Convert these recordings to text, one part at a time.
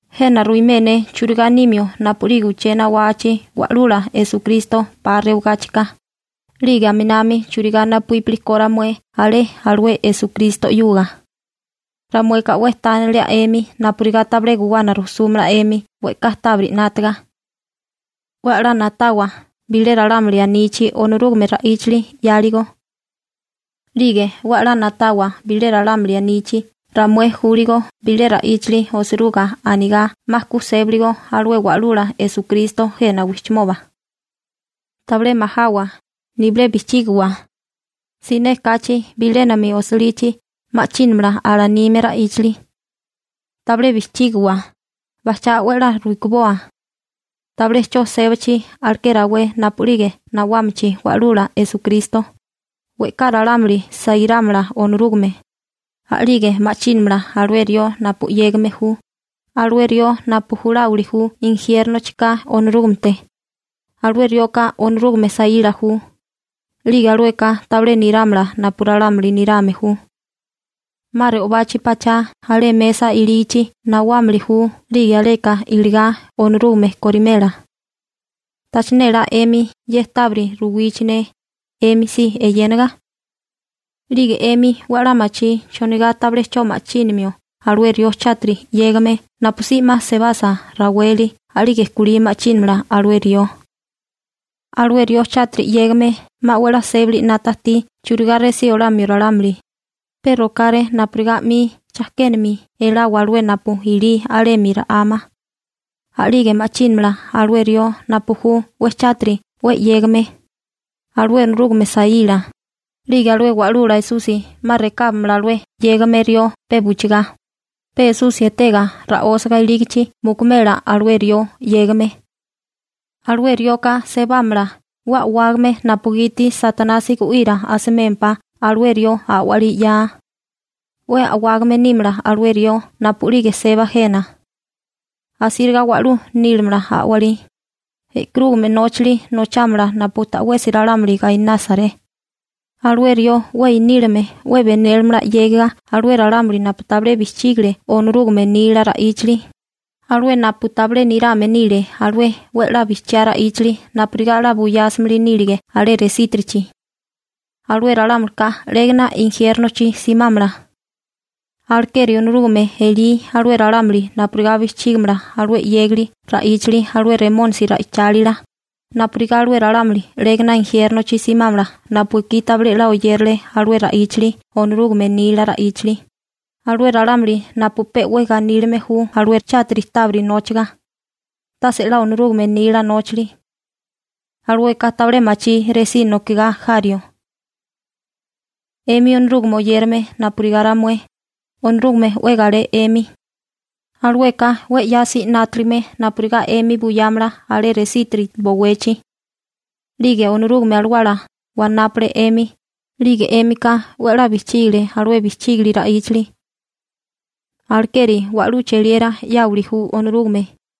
Jena ruimé ne churigá nimio napu'lige uché nawachi Wa'lula Esukristo 'pa rewagáchika, 'lige aminami churigá napuípili ko ramué alé alué Esukristo 'yuga. Ramueka 'we tánalia 'emi napurigá tabilé guwana rujsúmala 'emi we'ká tábiri 'nátaga. 'We a'lá na'tawa bilé ralámuli anichi Onorúgame ra'íchali 'yáligo. 'Lige 'we a'lá na'tawa bilé ralámuli anichi ramué júligo bilé ra'íchali osiruga anigá 'ma ku sébiligo alué Wa'lula Esukristo jena wijchimoba. Tabilé majawa, nibilé bijchígiwa. Siné kachi bilénami osilichi ma'chínamala alanime ra'íchali. Tabilé bijchígiwa, bajchá 'we a'lá rukiboa. Tabilé 'cho sébachi alaké rawé napu'lige nawámachi Wa'lula Esukristo, we'ká ralámuli sairámala Onorúgame, a'lige ma'chínamala alué rió napu 'yégame ju, alué rió napu juláwili ju injiérnochika Onorúgamete. Alué rioka Onorúgame saíla ju, 'lige alueka tabilé nirámala napu ralámuli nirame ju. 'Ma re'obachi pachá alé mesa ilígichi nawámili ju 'lige aleka iligá Onorúgame korimela. ¿Tacha nélá 'emi ne ye tábiri ruwichi ne 'emi si eyénaga? 'Lige 'emi 'we 'la machí chonigá tabilé 'cho ma'chínimio alué rió chátiri 'yégame napusí 'ma sebasa raweli a'lige kulí ma'chínamala alué rió. Alué rió chátiri 'yégame 'ma 'we 'la sébali 'nata ajtí churigá resí olamio ralámuli, pe rokáré napurigá 'mi chajkénami elawa alué napu ilí alemi ra'ama. A'lige ma'chínamala alué rió napu ju 'we chátiri 'we 'yégame, alué Onorúgame saíla. 'Lige alué Wa'lula Esusi 'ma rekábamala alué 'yégame rió pe buchigá. Pe Esusi etega ra'ósiga ilígichi mukumela alué rió 'yégame. Alué rioka sebámala 'we a'wágame napugiti Satanasi gu'ira asimémpá alué rió a'walí 'ya. 'We a'wágame nímala alué rió napu'lige seba jena. Asíriga wa'lú nílamala a'walí, e'karúgame nóchali nochámala napu ta'wesi ralámuli gainásaré. Alué rió 'we inílame 'we 'la benélimala 'yégiga alué ralámuli napu tabilé bijchígile Onorúgame nila ra'íchali, alué napu tabilé nirame nile alué 'we 'la bijchiá ra'íchali napurigá 'la buyásimili nílige alé resítirichi. Alué ralámulika 'légana injiérnochi simámala. Alekeri Onorúgame elí alué ralámuli napurigá bijchígamala alué 'yégali ra'íchali alué Remónisi ra'ichálila, napurigá alué ralámuli 'légana injiérnochi simámala napu ekí tabilé 'la oyérale alué ra'íchali Onorúgame nila ra'íchali, alué ralámuli napu pe 'we ganílime ju alué chátiri tábiri nóchaga, tase 'la Onorúgame nila nóchali. Alueka tabilé machí resí nokigá jario. 'Emi Onorúgame oyérame napurigá ramué, Onorúgame 'we galé 'emi, alueka 'we 'yasi 'nátaligame napurigá 'emi buyámala alé resítiri bowechi. 'Lige Onorúgame Alawala wanápale 'emi, 'lige 'émika 'we a'lá bijchígale alué bijchígili ra'íchali. Alekeri wa'lú cheliera 'yáwili ju Onorúgame.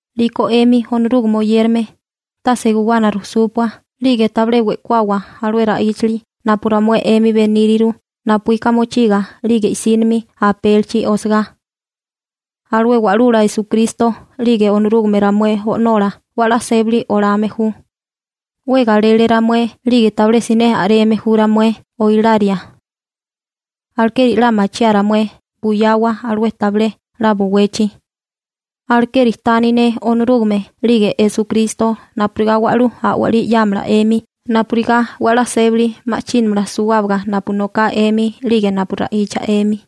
'Liko 'emi Onorúgame oyérame, tase guwana rujsúpua, 'lige tabilé we'kuawa alué ra'íchali napu ramué 'emi beníriru napuíka mochiga 'lige i'sínimi apélichi osagá. Alué Wa'lula Esukristo 'lige Onorúgame ramué O'nola 'we a'lá sébali olame ju. 'We galele ramué 'lige tabilé siné a'reme ju ramué oilaria. Alekeri 'la machiaa ramué buyawa alué tabilé a'lá bowechi. Alekeri tani ne Onorúgame 'lige Esukristo napurigá wa'lú a'walí 'yámala 'emi napurigá 'we a'lá sébali ma'chínamala suwábaga napu noká 'emi 'lige napu ra'icha 'emi.